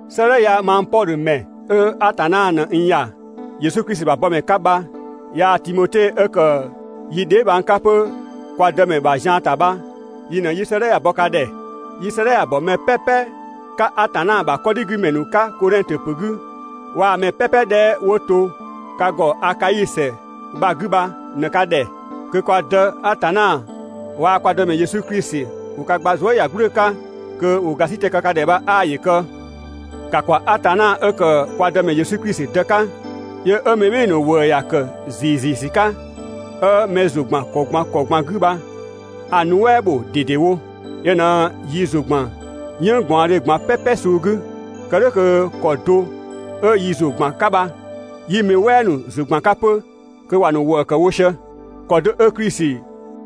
'Sëëdhɛ ya mang Pɔdhö ‑mɛ 'ö Atanna ꞊në n ‑ya Yesu Klisi ‑bha bɔmɛ 'ka bha, yaa‑ Timote 'ö ‑kë yi dheebhang 'ka 'pö kwa Dëmɛ bha‑ ‑bha zian ‑ta bha yi ꞊në 'yi‑ bɔ ka ‑dhɛ. Yi 'sëëdhɛ ya‑ ‑bɔ mɛ "pɛpɛ 'ka Atanna ‑bha 'kɔdhigümɛ ‑nu 'ka Kodhɛngtö ‑pö 'gü waa‑ mɛ "pɛpɛ 'dhɛ 'wo to 'wo ka ‑gɔ Akai ‑sɛ bha‑ 'gü bha ꞊në ka ‑dhɛ. Kö kwa Dë Atanna waa‑ kwa Dëmɛ Yesu Klisi 'ö 'dhö ‑wo ka gba zuëyagblü 'ka, kö ‑wo ‑gasitɛ kë ka ‑dhɛ bha ('aa ‑yö kë). ‑Ka ‑kwa Atanna 'ö ‑kë kwa Dëmɛ Yesu Klisi Dë 'ka, yö 'ö mɛ ‑nu ‑wëë ‑ya ‑kë ‑ziiziisü 'ka, 'ö mɛ ‑zʋ ‑gban ‑kɔ ꞊gban ‑kɔ ꞊gban 'gü bha‑ nuɛ" bho ꞊dedewo. Yö ꞊në yi ‑zʋ ‑gban "yënng ꞊gbaɔndhe ꞊gban "pɛpɛ suu 'gü, kë "dhʋ̈ kö ‑kɔ do 'ö yi ‑zʋ ‑gban 'ka bha 'yi mɛ "wɛɛ ‑nu ‑zʋ ‑gban 'ka 'pö kö ‑wa ‑nu ‑wëëkë wo sië. ‑Kɔ do 'ö Klisi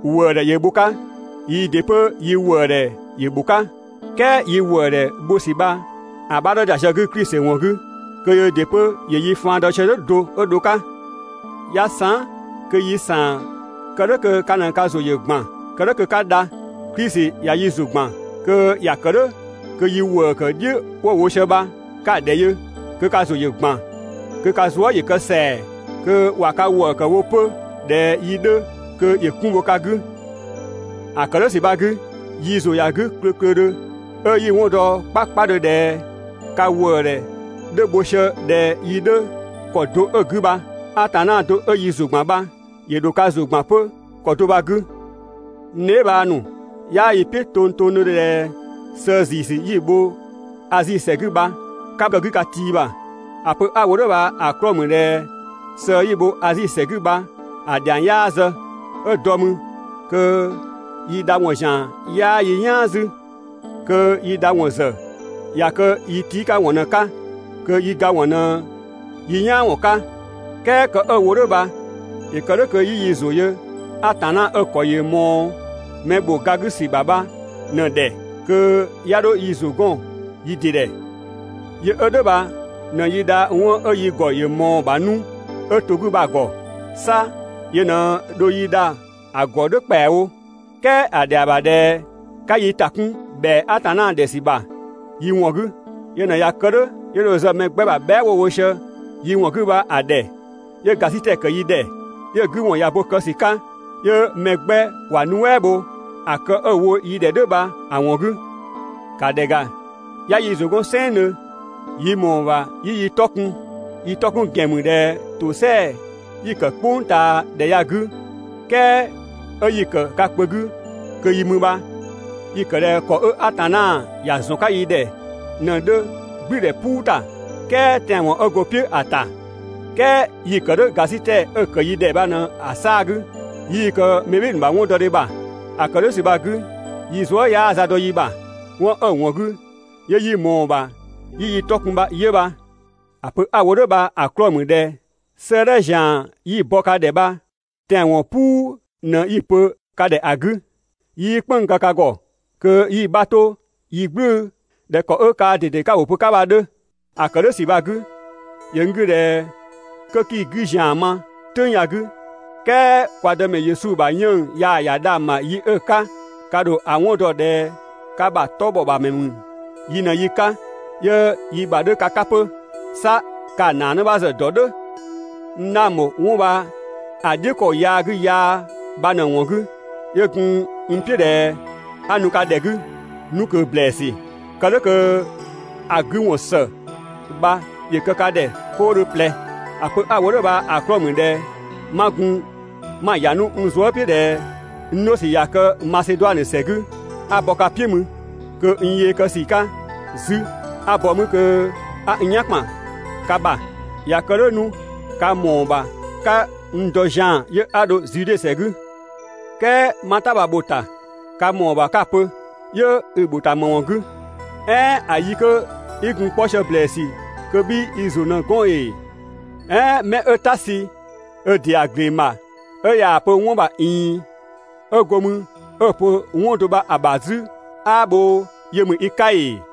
‑wëëdhɛ ‑yö bho‑ 'ka, yii ‑dɩ 'pö yi ‑wëëdhɛ ‑yö ‑bho 'ka, "kɛɛ yi ‑wëëdhɛ bho ‑sü bha‑ 'bha 'dhö ‑da sië‑ 'gü Klisi ‑wɔn 'gü kö Klisi ‑dɩ 'pö ‑yö yi faan dɔ sië "dhʋ̈ do 'ö dho‑ 'ka. 'Ya saan", kö yi ‑saan kë "dhʋ̈ kö ka ꞊në ka ‑zʋ ‑yö ‑gban, kë "dhʋ̈ kö 'ka dha. Klisi ꞊ya yi ‑zʋ ‑gban, kö ‑ya ‑kë "dhʋ̈ kö yi ‑wëëkë "dhiʋ̈ ‑nu 'wo‑ wo bha ka‑ ‑dhɛ yö, kö ka ‑zʋ ‑yö ‑gban, kö ka zuë" ‑yö kë ‑sɛa, kö ꞊wa ka ‑wëëkë wo 'pö ꞊dhɛ yi 'dhö kö ‑yö 'kun bho ka 'gü. ‑A ‑kë "dhʋ̈ ‑sü bha‑ 'gü, yi ‑zʋ ‑ya 'gü klöklödhö 'ö 'yi‑ 'wɔn dɔ 'kpakpadhö ꞊dhɛ ka ‑wëëdhɛ 'dhö bho sië ꞊dhɛ yi 'dhö ‑kɔ do 'ö‑ 'gü bha, Atanna do 'ö yi ‑zʋ ‑gban bha ‑yö ‑dho ka ‑zʋ ‑gban 'pö ‑kɔ do bha‑ 'gü. N dheebhang ‑nu, 'yaa yi "piʋ̈ tongtongdhö ꞊dhɛ sëë ‑ziisü 'yi‑ bho Azi ‑sɛ 'gü bha 'ka kë‑ 'gü ka ti ‑bha. ‑A pö 'a‑ wo "dhʋ̈ bha‑ 'klɔɔ‑ ‑mü ꞊dhɛ sëë 'yi‑ bho Azi ‑sɛ 'gü bha‑ ‑dhiang 'yaa zë. 'Ö dɔ mü kö yi dha ‑wɔn ‑zian 'yaa yi "yaan 'zü. Kö yi dha ‑wɔn ‑zë ꞊ya kë yi tii' 'ka ‑wɔn ꞊në‑ 'ka, kö yi ga ‑wɔn ꞊në yi "yaan ‑wɔn 'ka. "Kɛɛ kë 'ö‑ wo "dhʋ̈ bha ‑yö kë "dhʋ̈ kö 'yi yi ‑zʋ ‑ya Atanna 'ö‑ ‑kɔ ‑yö ꞊mɔɔ mɛ ‑bho ga 'gü ‑sü ‑bha 'bha ꞊në‑ ‑dhɛ, kö 'ya 'dho yi ‑zʋ 'gɔn yi ‑dɩ ‑dhɛ. Yö 'ö "dhʋ̈ bha ꞊në yi dha 'wɔn 'ö yi ‑gɔ ‑yö ꞊mɔɔ‑ ‑bha 'nu 'ö 'to‑ 'gü bha‑ ‑gɔ. 'Sa yö ꞊në dho yi dha‑ ‑gɔ "dhʋ̈ ‑kpɛawo. "Kɛɛ ‑a ‑dhɛa ‑bha ꞊dhɛ 'ka yi ‑ta 'kun ‑bhɛa Atanna ‑dhɛ ‑sü ‑bha yi ‑wɔn 'gü. Yö ꞊në ꞊ya kë "dhʋ̈, 'yö dho zë mɛ 'gbɛ ‑bha bhɛa" 'wo‑ wo sië yi ‑wɔn 'gü bha‑ ‑dhɛ 'yö ‑gasitɛ ‑kë yi ‑dhɛ. 'Yö‑ 'gü ‑wɔn ꞊ya bo kë ‑sü 'ka, 'yö mɛ 'gbɛ ‑wa nuɛ" bho ‑a kë 'ö‑ wo yi ‑dhɛ "dhʋ̈ bha‑ ‑wɔn 'gü. ‑Ka ‑dhɛ ‑ga, 'ya yi ‑zʋ 'gɔn "sɛnngdhö yi ‑mɔɔ ‑bha 'yi yi 'tɔ kun. Yi 'tɔ 'kun ‑gɛn ‑mü ꞊dhɛ ‑tosɛa 'yi‑ ‑kë "kpʋngtaadhɛ ya‑ 'gü, "kɛɛ 'ö 'yi‑ ‑kë ka kpö 'gü kö yi mü bha, yi‑ ‑kë ꞊dhɛ ‑kɔ 'ö Atanna ‑ya ‑zɔn 'ka yi ‑dhɛ ꞊në‑ 'dhö "gblüdhɛ "puu ‑ta "kɛɛ tɛanwɔn 'ö go‑ "piʋ̈ ‑a ‑ta, "kɛɛ yi‑ ‑kë "dhʋ̈ ‑gasitɛ 'ö‑ ‑kë yi ‑dhɛ bha ꞊në‑ 'saa‑ 'gü, 'yii‑ kë mɛ ‑nu ‑bha 'wɔndɔdhe ‑bha. ‑A ‑kë "dhʋ̈ ‑sü bha‑ 'gü yi zuë" 'yaa za dɔ yi ‑bha. 'Wɔn 'ö‑ ‑wɔn 'gü 'yö 'yi ꞊mɔɔ‑ ‑bha 'yi yi 'tɔ kun bha 'yö bha. ‑A pö 'a‑ wo "dhʋ̈ bha‑ 'klɔɔ‑ ‑mü ꞊dhɛ 'sëëdhɛ ‑zian 'yi‑ bɔ ka ‑dhɛ bha tɛanwɔn "puu ꞊në 'yi‑ pö ka ‑dhɛ ‑a 'gü, 'yii "kpënng‑ kë ka ‑gɔ kö 'yi‑ 'bha 'to yi "gblu ꞊dhɛ ‑kɔ 'ö kaa ꞊dede 'ka‑ ‑wʋ pö‑ 'ka bha‑ 'dhö. ‑A ‑kë "dhʋ̈ ‑sü bha‑ 'gü ‑yö n 'gü ꞊dhɛ 'kö 'kii‑ 'gü ‑zian ma "tʋ̈ng ya‑ 'gü "kɛɛ kwa Dëmɛ Yesu ‑bha 'yiën‑ yaa‑ ‑ya dhang‑ ‑bha yi 'ö‑ 'ka ka ‑dho ‑a 'wɔn dɔ ꞊dhɛ ka ‑bhaa 'tɔ ‑bhɔ ‑bha ‑mɛ ‑mü yi ꞊në yi 'ka 'yö yi ‑bha 'dhö ka 'ka 'pö. 'Sa ka‑ ‑naa 'në 'bha ‑zë ‑dɔ "dhʋ̈. N 'dhang ‑bho 'wɔn bha‑ "dhiʋ̈ ‑kɔ yaa 'gü yaa bha ꞊në‑ ‑wɔn 'gü, 'yö gun n "piʋ̈ ꞊dhɛ 'a nu ka ‑dhɛ 'gü 'nu ꞊kö ‑blɛɛsü, kë "dhʋ̈ kö‑ 'gü ‑wɔn ‑së bha ‑yö kë ka ‑dhɛ 'koodhö ꞊plɛ. ‑A pö 'a‑ wo "dhʋ̈ bha‑ 'klɔɔ‑ ‑mü ꞊dhɛ 'ma gun 'ma‑ ‑ya 'nu n ‑zʋ "piʋ̈ ꞊dhɛ n 'dho ‑sü ꞊ya kë Maseduanö ‑sɛ 'gü 'a bɔ ka "piʋ̈ mü, kö n yee kë ‑sü 'ka 'zü 'a bɔ 'mü kö 'a n "yan 'bha ‑kpan ka ‑bha. ꞊Ya kë "dhʋ̈ 'nu ka ‑mɔɔ ‑bha 'ka n dɔ zian‑ 'yö 'a 'dho Zude ‑sɛ 'gü. ("Kɛɛ 'ma‑ "ta bha‑ bho‑ ‑ta.) Ka ‑mɔɔ ‑bha 'ka‑ pö: «'Yö i‑ ‑bho ‑ta ‑më ‑wɔn 'gü? "Ɛɛn ‑a yi 'kö 'i gun‑ 'kpɔ sië ‑blɛɛsü kö 'bhii i ‑zʋ 'pö‑ 'gɔn ‑ee? "Ɛɛn 'mɛ 'ö "ta sü ö ‑dɩa ‑gleng ‑bha 'ö ꞊yaa‑ pö 'wɔn ‑bha ꞊iin 'ö go 'mü 'ö‑ pö 'wɔn do bha‑ ‑bha 'zü 'aa bhoo yö ‑mü i 'ka ‑ee?»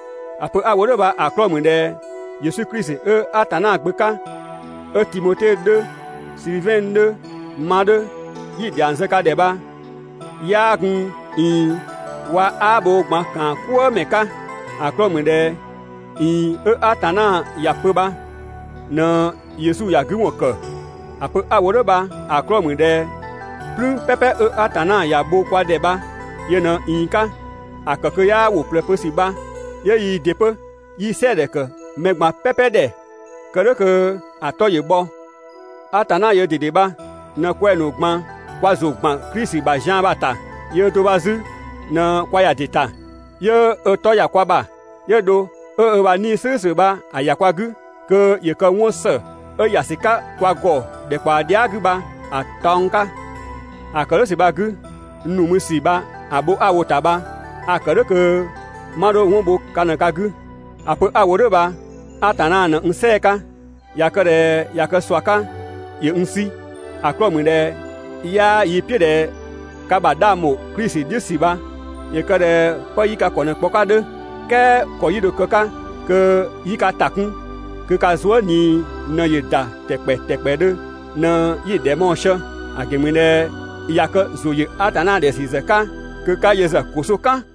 ‑A pö 'a‑ wo "dhʋ̈ bha‑ 'klɔɔ‑ ‑mü ꞊dhɛ Yesu Klisi 'ö Atanna Gbö 'ka 'ö Timote 'dhö, Silivɛn 'dhö, ma 'dhö, 'yi‑ ‑dhiang zë ka ‑dhɛ bha 'yaa gun ꞊iin waa‑ "uun ꞊gban ‑kaankwëëmɛ 'ka. ‑A 'klɔɔ‑ ‑mü ꞊dhɛ ꞊iin‑ 'ö Atanna ‑ya pö bha ꞊në Yesu ‑ya 'gü ‑wɔn ‑kë. ‑A pö 'a‑ wo "dhʋ̈ bha‑ 'klɔɔ‑ ‑mü ꞊dhɛ "plüün "pɛpɛ 'ö Atanna ‑ya bho kwa ‑dhɛ bha yö ꞊në‑ ꞊iin 'ka. ‑A ‑kë kö 'yaa ‑wʋ ꞊plɛ pö ‑sü bha 'yö yii ‑dɩ 'pö 'yi‑ "sɛɛdhɛ ‑kë mɛ ꞊gban "pɛpɛ ‑dhɛ kë "dhʋ̈ kö‑ 'tɔ ‑yö bhɔ. Atanna yöö ꞊dede bha ꞊në kwɛng‑ ‑nu ꞊gban kwa ‑zʋ ‑gban Klisi ‑bha zian bha‑ ‑ta. Yöö do bha 'zü ꞊në kwa ‑ya ‑dɩ ‑ta. 'Yö ö 'tɔ ‑ya kwa ‑bha, 'yö dho 'ö ö ‑bha 'Nii‑ "slʋ̈ʋ̈slʋ̈ bha‑ ‑ya kwa 'gü kö ‑yö kë 'wɔnsë 'ö‑ ‑ya ‑sü 'ka kwa ‑gɔ ‑dhɛkpaɔ dhia" 'gü bha‑ taɔng 'ka. ‑A ‑kë "dhʋ̈ ‑sü bha‑ 'gü, n ‑nu mü ‑sü bha‑ bho 'a‑ wo‑ ‑ta bha a‑ ‑kë "dhʋ̈ kö 'ma 'dho 'wɔn bho ka ꞊në ka 'gü. ‑A pö 'a‑ wo "dhʋ̈ bha Atanna ꞊në n "sɛɛ‑ 'ka, ꞊ya kë ꞊dhɛ ꞊ya kë ꞊sua 'ka ‑yö n 'sü. ‑A 'klɔɔ‑ ‑mü ꞊dhɛ 'yaa yi "piʋ̈ ꞊dhɛ ka ‑bha 'dhang ‑bho Klisi "dhiʋ̈ ‑sü bha ‑yö kë ꞊dhɛ 'pë 'yi ka ‑kɔ ꞊në‑ kpɔ‑ 'ka ‑a 'dhö. "Kɛɛ ‑kɔ 'yi dho‑ kë‑ 'ka kö 'yi ka ‑ta 'kun kö ka zuë" ꞊nii ꞊në ‑yö ‑da tɛkpɛtɛkpɛdhö ꞊në 'yi‑ ‑dhɛ mɔɔ sië. ‑A ‑gɛn ‑mü ꞊dhɛ ꞊ya kë ‑zʋ ‑yö Atanna ‑dhɛ ‑sü ‑zë 'ka kö 'ka yö ‑zë ‑koso "kan.